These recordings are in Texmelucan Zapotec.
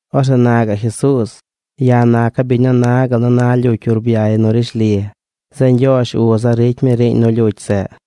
Orzeꞌ na gaꞌ Jesuuz: ―Ya̱ naca̱ biñ nu na gal nu na lyucy urbyay nu rishli. Zeꞌ Ñgyoozh uza̱ ricy mi riiñ nu lyucy zeꞌ.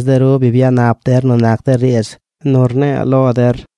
Tees de ru bi byanap der nu nac de riidz nu rne̱e̱ lo der.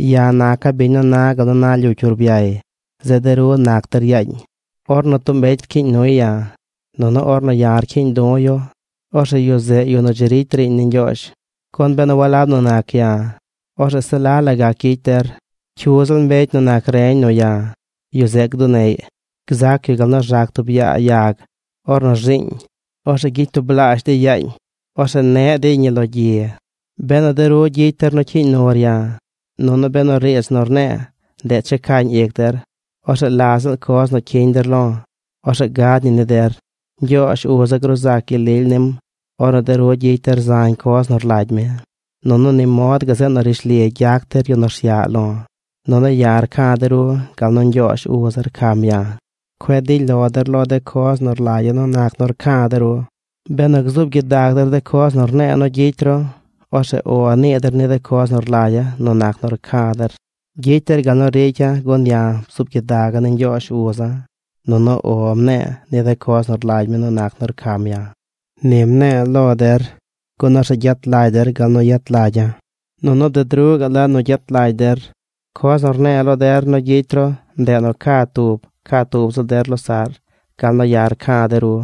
’Ya̱ naca̱ biñ nu na gal nu na lyucy urbyay. Zeꞌ de ru nac der yaañ. Ornu tub mbecy rcyiiñ nuy ya̱, nunu ornu ya̱ rcyiiñ du̱ yu, orzeꞌ yu zeꞌ yu nu dzi ricy riiñ ni Ñgyoozh. Gun benu walab nu nac ya̱, orzeꞌ se la la gac gyicy der. Cyu ziꞌl mbecy nu nac reñ nu ya̱, yu zeꞌ gduneꞌy. Gzac yu gal nu rzac tub yaa yag ornu rzi̱i̱ñ. Orzeꞌ gyicy tublaazh dey yaañ. Orzeꞌ ne̱ꞌ dey ñi lo gyi. ’Benu de ru gyicy der nu cyiiñ nur ya̱, nunu benu riidz nu rne̱e̱ ndeꞌ checañ ic der, orzeꞌ la ziꞌl coz nu cyiñ der lo̱, orzeꞌ gad ñi ni der. Ñgyoozh uza̱ gruu zac gyel lily nim ornu de ru gyicy der zañ coz nu rlagy mi. Nunu ni mod gazeꞌ nu rishli gyac der yu nu rsyaꞌ lo̱. Nunu ya̱ rca̱ de ru gal nu Ñgyoozh uza̱ rcam ya̱. Cueꞌ dily lo der lo de coz nu rlagya̱ nu nac nu rca̱ de ru. Benu gzuub gyidag der de coz nu rne̱e̱ nu gyicy ru, orzeꞌ “O” nii der ni de coz nu rlagya̱ nu nac nu rca̱ der. Gyicy der gal nu ricya̱ gun ya̱ bzuub gyidaga̱ ni Ñgyoozh uza̱, nunu “O” mne̱e̱ ni de coz nu rlagy mi nu nac nu rcam ya̱. ’Ni mne̱e̱ lo der, gun orzeꞌ gyet lagy der gal nu yet lagya̱. Nunu bded ruꞌ gaꞌ la nu gyet lagy der. Coz nu rne̱e̱ lo der nu gyicy ru ndeꞌ nu ca tub, ca tub ziꞌl der losaꞌr gal nu ya̱ rca̱ de ru.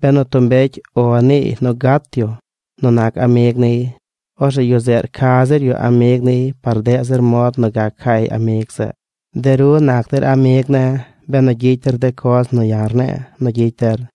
Benu tub mbecy “O” niiy nu gat yu nu nac amig niy, orzeꞌ yu zeꞌ rca zir yu amig niy par deꞌ zir mod nu gac cay amig zeꞌ. De ru nac der amig ne̱ benu gyicy der de coz nu ya̱ rne̱e̱ nu gyicy der.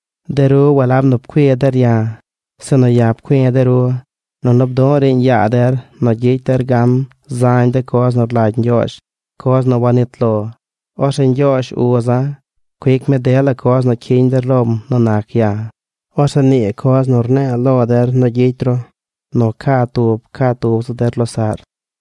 De ru walab nu pcui der ya̱, sinu ya̱ pcui̱ de ru nunu bdu̱ꞌ riiñ yaa der nu gyicy der gan zañ de coz nu rlagy Ñgyoozh, coz nu wanit lo. Orzeꞌ Ñgyoozh, uza̱, cuic mi dela coz nu cyiñ der lom nu nac ya̱. Orzeꞌ nii coz nu rne̱e̱ lo der nu gyicy ru: Nu ca tub, ca tub ziꞌl der losaꞌr.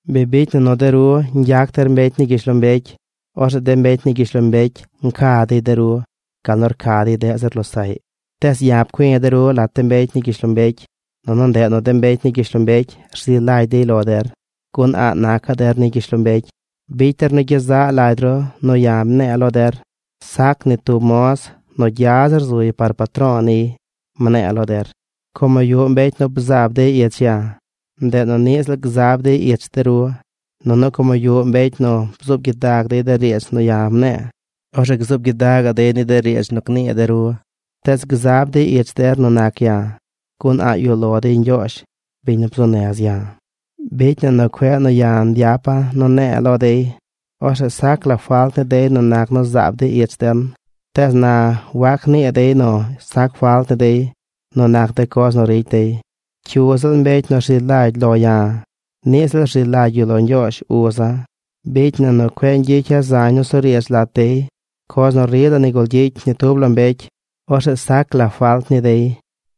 Bi bicy na nu de ru ñgyac der mbecy ni gyishlombecy, orzeꞌ de mbecy ni gyishlombecy nca dey de ru gal nu rca dey deꞌ zir losaꞌy. Tees ya̱ pcui̱ de ru lat de mbecy ni gyishlombecy, nunu ndeꞌ nu de mbecy ni gyishlombecy rzi lagy dey lo der. Gun a̱ꞌ nacaꞌ der ni gyishlombecy. Bicy der nu gyezaꞌ lagy ru nu ya̱ mne̱e̱ lo der: “Sac ni tub moz nu gya zir zuy par patro̱o̱ niy”, mne̱e̱ lo der. Como yuꞌ mbecy nu bzab dey ich ya̱, ndeꞌ nu niꞌ ziꞌl gzab dey ich de ru. Nunu como yuꞌ mbecy nu bzuub gyidag dey de riidz nu ya̱ mne̱e̱, orzeꞌ gzuub gyidagaꞌ dey ni de riidz nu gnii de ru. Tees gzab dey ich der nu nac ya̱, gun a̱ꞌ yuꞌ lo dey Ñgyoozh, biñ nu bzuu nez ya̱. ’Bicy na nu cueꞌ nu ya̱ nyapa̱ nu nne̱e̱ lo dey, orzeꞌ sac la falt ni dey nu nac nu zaab dey ich den. Tees na wac nii dey nu sac falt ni dey nu nac de coz nu ricy dey. Cyu ziꞌl mbecy nu rzi lagy lo ya̱, niꞌ ziꞌl rzi lagy yu lo Ñgyoozh uza̱. Bicy na nu cueꞌ ñgyicya̱ zañ nusuriidz lat dey, coz nu rila nigul gyicy ni tub la mbecy, orzeꞌ sac la falt ni dey.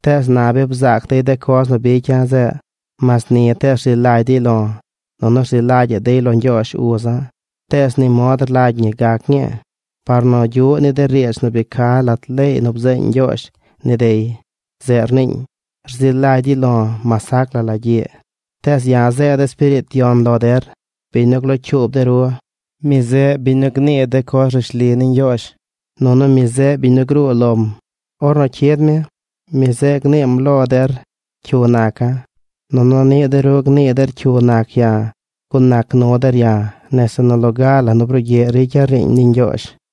Tees na bi bzaac dey de coz nu bicya̱ zeꞌ. Mas ni tees rzi lagy dey lo̱ nunu rzi lagya̱ꞌ dey lo Ñgyoozh, uza̱. Tees ni mod rlagy ñi gac ñii par nu gyuꞌ ni de riidz nu bi ca lat leey nu bzeeñ Ñgyoozh ni dey. Zeꞌ rniiñ: “Rzi lagy dey lo̱ mas sac la la gyiꞌ.” ’Tees ya̱ zeeda̱ Espiriit Yon lo der, biñ nu glocyuub de ru. Mi zeꞌ biñ nu gnii de coz rishli ni Ñgyoozh nunu mi zeꞌ biñ nu gruu lom. Ornu cyid mi, mi zeꞌ gniim lo der cyu naca̱. Nunu niꞌ de ru gnii der cyu nac ya̱ gun nac nu der ya̱ nese nu loga la nu brugyiꞌ ricya̱ riiñ ni Ñgyoozh.